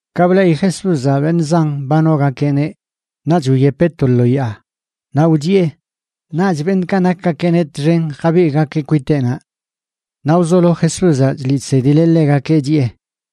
Ka bleꞌi Jesúzaꞌ beṉꞌ zan ba nogakeꞌneꞌ, naꞌch wyepeꞌ to lo yaa, naꞌ wchiꞌe. Naꞌch beṉꞌkaꞌ nakgakeꞌneꞌ txen jabigꞌgakeꞌ kwiteꞌnaꞌ. Naꞌ wzolo Jesúzaꞌ chliꞌ chsedileꞌ ḻegakeꞌ, chiꞌe: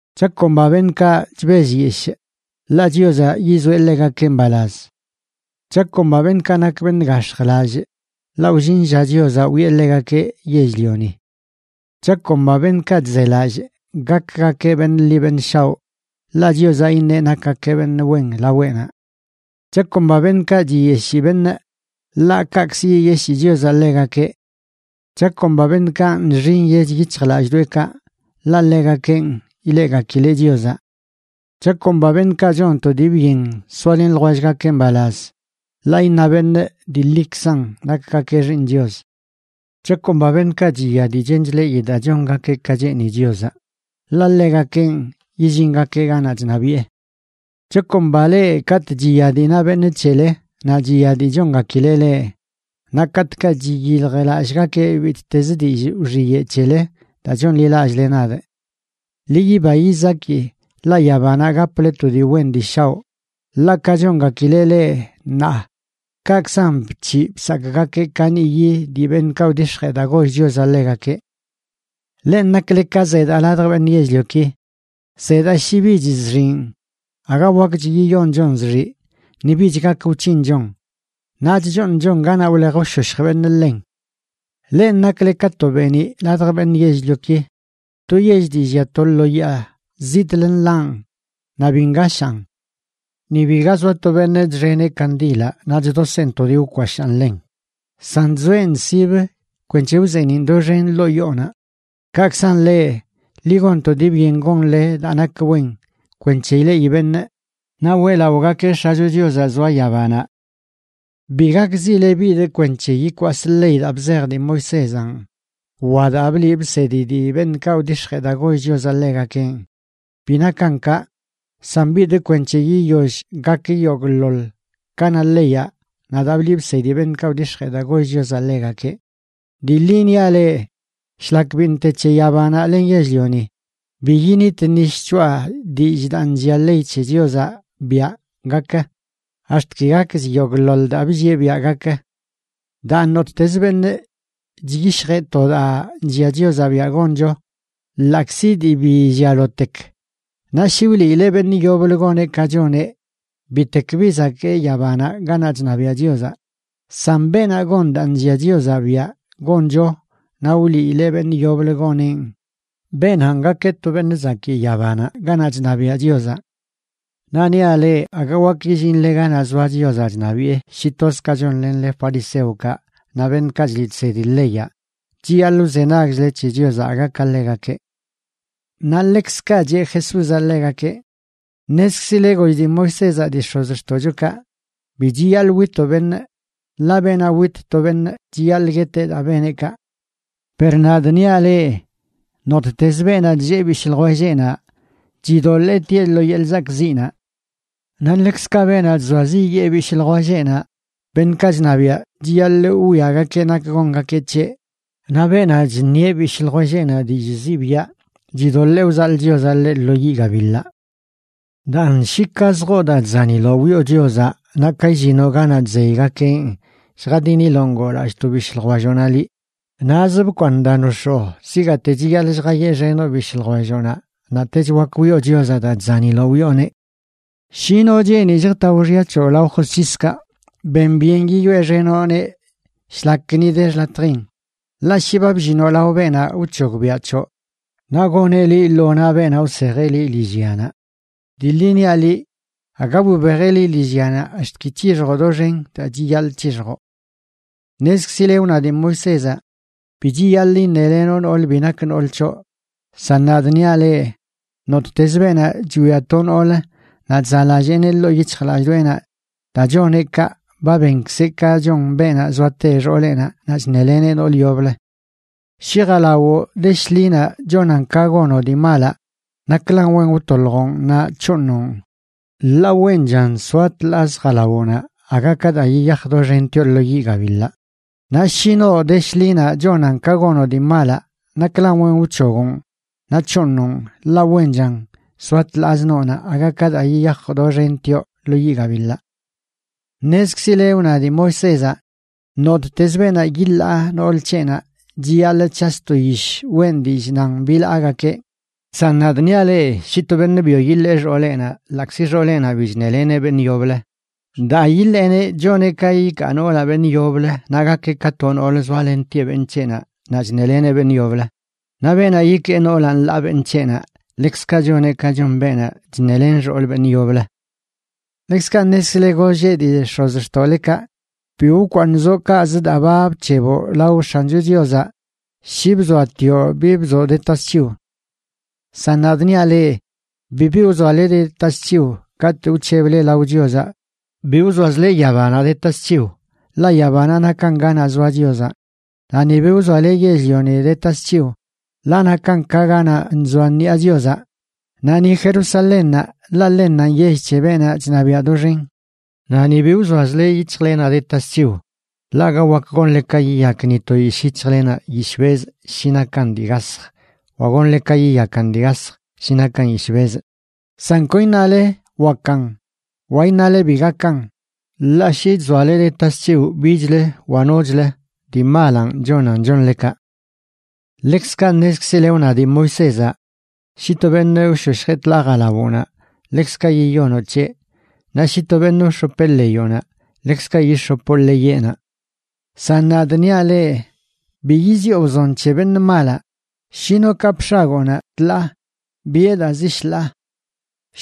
’Chakomba beṉꞌkaꞌ chbellyeshꞌ, ḻaꞌ Chiozaꞌ yizoeꞌ ḻegakeꞌ mbalaz. ’Chakomba beṉꞌkaꞌ nak beṉꞌ gax̱jlallꞌ, ḻaꞌ wllin lla Chiozaꞌ wiꞌe ḻegakeꞌ yell-lioni. ’Chakomba beṉꞌkaꞌ chzelallꞌ gakgakeꞌ beṉꞌ ḻi beṉꞌ shaoꞌ, ḻaꞌ Chiozaꞌ iṉeꞌ nakgakeꞌ beṉꞌ wen laweꞌnaꞌ. ’Chakomba beṉꞌkaꞌ chiyeshii beṉꞌ, ḻaꞌ kaꞌkzə yiyeshii Chiozaꞌ ḻegakeꞌ. ’Chakomba beṉꞌkaꞌ nxi nyech yic̱hjlallꞌdoꞌekaꞌ, ḻaꞌ ḻegakenꞌ ileꞌgakileꞌ Chiozaꞌ. ’Chakomba beṉꞌkaꞌ chon to dii byen soalen ljwellgakeꞌ mbalaz, ḻaꞌ iṉa beṉꞌ dii ḻikzan nakgakeꞌ xiiṉ Chios. ’Chakomba beṉꞌkaꞌ chiya dii chen chleꞌi daa chongakeꞌ ka cheeni Chiozaꞌ, ḻaꞌ ḻegakenꞌ yillingakeꞌ ganaꞌ chṉabiꞌe. ’Chakomba leꞌ katꞌ chiya dii na beṉꞌ c̱hele naꞌ chiya dii chongakileꞌ leꞌ, naꞌ katꞌkaꞌ chiyiljlallꞌgakeꞌ bittezə dillꞌ wxiyeꞌ c̱hele daa chonḻilallꞌle nadꞌ. Ḻi yiba yizaki, ḻaꞌ yabanaꞌ gaple to dii wen dii shaoꞌ. Ḻaꞌ ka chongakileꞌ leꞌ ṉaa, kaꞌkzan bc̱hiꞌ bsakꞌgakeꞌ kaniꞌyi dii beṉꞌkaꞌ wdix̱jee daa goll Chiozaꞌ ḻegakeꞌ. ’Lenꞌ nakle ka zedaa ladj beṉꞌ yell-lioki. Zedaa, shi bich zxiꞌn, aga wakch yiyonchon zxiꞌ ni bich gak wc̱hinchon, naꞌ chchooṉchon ganaꞌ wlej wshoshj beṉꞌ ḻen. ’Lenꞌ nakle ka to beeniꞌ ladj beṉꞌ yell-lioki. To yell dii llia to lo yaa, zitꞌlə nḻaꞌn, naꞌ bi ngashaan. Ni biga zoa to beṉꞌ chxeneꞌ kandilaꞌ naꞌ chdoseꞌn to dii wkwashaan ḻen, san chzoeꞌn sibə kwenc̱he wzeeniꞌn doxen ḻoo yoonaꞌ. Kaꞌkzan leꞌ, ḻi gon to dii byen gonle daa nak wen kwenc̱he ileꞌi beṉꞌ naꞌ weꞌlaꞌogakeꞌ X̱acho Chiozaꞌ zoa yabanaꞌ. ’Bi gakzile bidꞌ kwenc̱he yikwasꞌ ley daa bzej dii Moisézanꞌ wa daa bliꞌ bsedi dii beṉꞌkaꞌ wdix̱jee daa goll Chiozaꞌ ḻegakenꞌ. Bi nakan kaꞌ, san bidꞌ kwenc̱he yiyoll gak yogꞌḻoḻ ka na leyaꞌ naꞌ daa bliꞌ bsedi beṉꞌkaꞌ wdix̱jee daa goll Chiozaꞌ ḻegakeꞌ. Dii ḻi niaꞌ leꞌ, shlak biṉꞌ te c̱he yabanaꞌ len yell-lioni, bi init ni shc̱hoꞌa dillꞌ daa nllia ley c̱he Chiozaꞌ biaꞌ gak, ax̱t ki gakch yogꞌḻoḻ daa bllieꞌ biaꞌ gak. Daan, nottezə beṉꞌ chyishjeꞌ to daa nllia Chiozaꞌ biaꞌ goncho, ḻaꞌkzi dii bi llialotek, naꞌ shi wliileꞌ beṉꞌ yoblə goneꞌ ka choneꞌ, bitek bi zakee yabanaꞌ ganaꞌ chṉabiaꞌ Chiozaꞌ. San beenaꞌ gon daa nllia Chiozaꞌ biaꞌ goncho naꞌ wliileꞌ beṉꞌ yoblə goneꞌn, beenanꞌ gakeꞌ to beṉꞌ zakii yabanaꞌ ganaꞌ chṉabiaꞌ Chiozaꞌ. Naꞌ niaꞌ leꞌ, aga wak yillinle ganaꞌ zoa Chiozaꞌ chṉabiꞌe shi toz ka chonlenle fariseokaꞌ naꞌ beṉꞌkaꞌ chliꞌ chsedi leyaꞌ, chiyaḻꞌ wzenagchle c̱he Chiozaꞌ aga ka ḻegakeꞌ. Naꞌ ḻekzkaꞌ cheꞌ Jesúzaꞌ ḻegakeꞌ: ―Ṉezkzile goll dii Moisézaꞌ dii x̱ozxtoꞌchokaꞌ: “Bi chiyaḻꞌ witoꞌ beṉꞌ. Ḻaꞌ beenaꞌ wit to beṉꞌ chiyaḻꞌ gueteꞌ daa beneꞌ kaꞌ.” Per nadꞌ niaꞌ leꞌ, nottez beenaꞌ chllee bishꞌ ljwelleꞌnaꞌ chidoḻee tieꞌ lo yeḻꞌ zakꞌziꞌnaꞌ. Naꞌ ḻekzkaꞌ beenaꞌ chzoaziꞌyee bishꞌ ljwelleꞌnaꞌ, beṉꞌkaꞌ chṉabiaꞌ chiyaḻꞌ wwiagakeꞌ nak gongakeꞌ c̱heꞌ; naꞌ beenaꞌ chṉieꞌ bishꞌ ljwelleꞌnaꞌ dillꞌ zibiaꞌ, chidoḻee wzaḻꞌ Chiozaꞌ ḻeꞌ lo yiꞌ gabiḻaꞌ. ’Daan, shi ka zjoo daa chzaniloꞌ wiꞌo Chiozaꞌ naꞌ ka illinoꞌ ganaꞌ chzeygakeꞌn lljadiniloꞌ ngoolallꞌ to bishꞌ ljwelloꞌnaꞌ liꞌ, naꞌz bkwaaṉ daa nox̱oo, zigaate chiyaḻꞌ lljayeꞌxenoꞌ bishꞌ ljwelloꞌnaꞌ, naꞌtech wak wiꞌo Chiozaꞌ daa chzaniloꞌ wiꞌoneꞌ. ’Shi no cheeni lljtao xya c̱hoꞌ lao josc̱hiskaꞌ, ben byen yiyoeꞌxenoꞌneꞌ shlak ni de xḻatjin. Ḻaꞌ shi ba bllinoꞌ lao beenaꞌ wc̱hogbiaꞌ c̱hoꞌ, naꞌ goneꞌ liꞌ lo naꞌ beenaꞌ wsejeꞌ liꞌ lillyanaꞌ. Dii ḻi niaꞌ liꞌ, aga wibejeꞌ liꞌ lillyanaꞌ ax̱t ki c̱hixjoꞌ doxen daa chiyaḻꞌ c̱hixjoꞌ. ’Ṉezkzile wna dii Moisézaꞌ: “Bi chiyaḻꞌ iṉelenoꞌ nool bi nak nool c̱hoꞌ.” San nadꞌ niaꞌ leꞌ, nottez beenaꞌ chwia to noolə naꞌ chzaꞌlalleeneꞌ ḻoo yic̱hjlallꞌdoꞌenaꞌ, daa choneꞌ kaꞌ ba benkzeꞌ ka chon beenaꞌ zoate xooleꞌnaꞌ naꞌ chṉeleneꞌ nool yoblə. ’Shi jalawoꞌ de shḻinaꞌ chonan ka gonoꞌ dii malaꞌ, naklan wen wtoḻjoꞌn naꞌ c̱hooṉoꞌn. Ḻaꞌ wenchan soa tḻaaz jalawoꞌnaꞌ aga ka daa yiyaj doxentioꞌ lo yiꞌ gabiḻaꞌ. Naꞌ shi noo de shḻinaꞌ chonan ka gonoꞌ dii malaꞌ, naklan wen wc̱hogoꞌn naꞌ c̱hooṉoꞌn, ḻaꞌ wenchan soa tḻaaz noonaꞌ aga ka daa yiyaj doxentioꞌ lo yiꞌ gabiḻaꞌ. ’Ṉezkzile wna dii Moisézaꞌ: “Nottez beenaꞌ yiḻaa nool c̱heꞌnaꞌ chiyaḻꞌ c̱has to yish weꞌn dillꞌ nan bilaagakeꞌ.” San nadꞌ niaꞌ leꞌ shi to beṉꞌ byo yiḻee xooleꞌnaꞌ ḻaꞌkzi xooleꞌnaꞌ bi chṉeleneꞌ beṉꞌ yoblə, daa yiḻeeneꞌ choneꞌ ka yikaa noolaꞌ beṉꞌ yoblə naꞌ gakeꞌ ka to noolə zoalentieꞌ beṉꞌ c̱heꞌnaꞌ naꞌ chṉeleneꞌ beṉꞌ yoblə. Naꞌ beenaꞌ yikee noolaꞌ nḻaa beṉꞌ c̱heꞌnaꞌ, ḻekzkaꞌ choneꞌ ka chon beenaꞌ chṉelen xool beṉꞌ yoblə. ’Ḻekzkaꞌ ṉezkzile golleꞌ dii x̱ozxtoꞌlekaꞌ: “Bi wkwaaṉzoꞌ kaꞌzə daa ba bc̱heboꞌ lao X̱ancho Chiozaꞌ shi bzoatioꞌ bi bzoꞌ de tasc̱hiw.” San nadꞌ niaꞌ leꞌ, bibi wzoale de tasc̱hiw katꞌ wc̱heble lao Chiozaꞌ. Bi wzoazle yabanaꞌ de tasc̱hiw, ḻaꞌ yabanaꞌ nakan ganaꞌ zoa Chiozaꞌ. Naꞌ ni bi wzoale yell-lioni de tasc̱hiw, ḻaꞌ nakan ka ganaꞌ nzoa ṉiꞌa Chiozaꞌ; naꞌ ni Jerusalénnaꞌ, ḻaꞌ ḻennanꞌ yell c̱he beenaꞌ chṉabiaꞌ doxen. Naꞌ ni bi wzoazle yic̱hjlenaꞌ de tasc̱hiw, ḻaꞌ aga wak gonle ka yiyak ni to yishꞌ yic̱hjlenaꞌ yishꞌ bezꞌ shi nakan dii gasj wa gonle ka yiyakan dii gasj shi nakan yishꞌ bezꞌ. San kon iṉale “wakan” wa iṉale “bi gakan”, ḻaꞌ shi chzoale de tasc̱hiw bichlə wa nochlə, dii malanꞌ chonan chonle kaꞌ. ’Ḻekzkaꞌ ṉezkzileꞌ wna dii Moisézaꞌ: “Shi to beṉꞌ wshoshjeꞌ tḻaa jalawoꞌnaꞌ ḻekzkaꞌ yiyonoꞌ c̱heꞌ. Naꞌ shi to beṉꞌ wx̱opeꞌ ḻeyoꞌnaꞌ, ḻekzkaꞌ yix̱opoꞌ ḻeyeꞌnaꞌ.” San nadꞌ niaꞌ leꞌ: Bi yiziꞌo wzon c̱he beṉꞌ malaꞌ. Shi no kapꞌ x̱agoonaꞌ tḻaa, biꞌe daa zi shḻaa.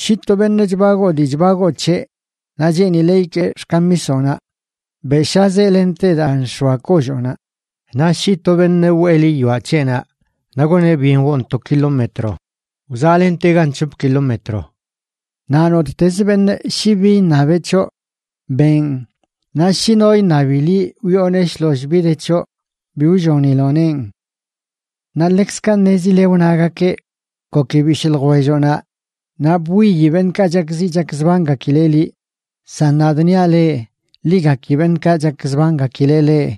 Shi to beṉꞌ chbagoo dii chbagoo c̱heꞌ naꞌ cheenileꞌ ikee xkamisoꞌnaꞌ, beꞌshazeꞌ lente daa nx̱oa kolloonaꞌ. Naꞌ shi to beṉꞌ wwee liꞌ yoaꞌ c̱heꞌnaꞌ naꞌ goneꞌ byen woon to kilómetro, wzaꞌlentegan c̱hop kilómetro. Naꞌ nottezə beṉꞌ shi bi iṉabeꞌ c̱hoꞌ, beꞌn. Naꞌ shi no iṉabi liꞌ wiꞌoneꞌ shloll bi de c̱hoꞌ, bi wlloniloꞌneꞌn. ’Naꞌ ḻekzkaꞌ ṉezile wnagakeꞌ: “Goki bishꞌ ljwelloꞌnaꞌ naꞌ bwiyi beṉꞌkaꞌ chakziꞌ chakzbangakileꞌ liꞌ.” San nadꞌ niaꞌ leꞌ: Ḻi gaki beṉꞌkaꞌ chakzbangakileꞌ leꞌ,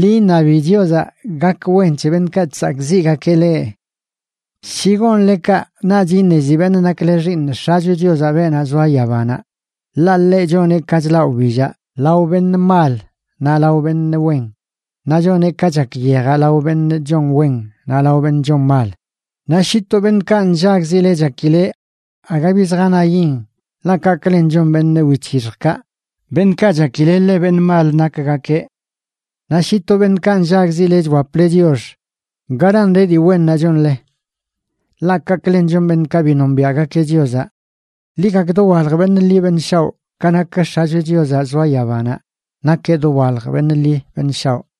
ḻi iṉabi Chiozaꞌ gak wen c̱he beṉꞌkaꞌ chsakꞌziꞌgakeꞌ leꞌ. Shi gonle kaꞌ, naꞌch iṉezi beṉꞌ nakle xiiṉ X̱acho Chiozaꞌ, beenaꞌ zoa yabanaꞌ. Ḻaꞌ ḻeꞌ choneꞌ ka chlaꞌ wbillaꞌ lao beṉꞌ mal naꞌ lao beṉꞌ wen, naꞌ choneꞌ ka chak yejaꞌ lao beṉꞌ chon wen naꞌ lao beṉꞌ chon mal. Naꞌ shi to beṉꞌkaꞌ nllagzile chakile, aga bi zjanayin, ḻaꞌ kaꞌklen chon beṉꞌ wic̱hixjkaꞌ beṉꞌkaꞌ chakile ḻe beṉꞌ mal nakgakeꞌ. Naꞌ shi to beṉꞌkaꞌ nllagzile chwaple chiox, ¿garan de dii wennaꞌ chonle? Ḻaꞌ kaꞌklen chon beṉꞌkaꞌ bi nombiaꞌgakeꞌ Chiozaꞌ. Ḻi gak dowalj beṉꞌ ḻi beṉꞌ shaoꞌ ka nak X̱acho Chiozaꞌ zoa yabanaꞌ, nakeꞌ dowalj beṉꞌ ḻi beṉꞌ shaoꞌ.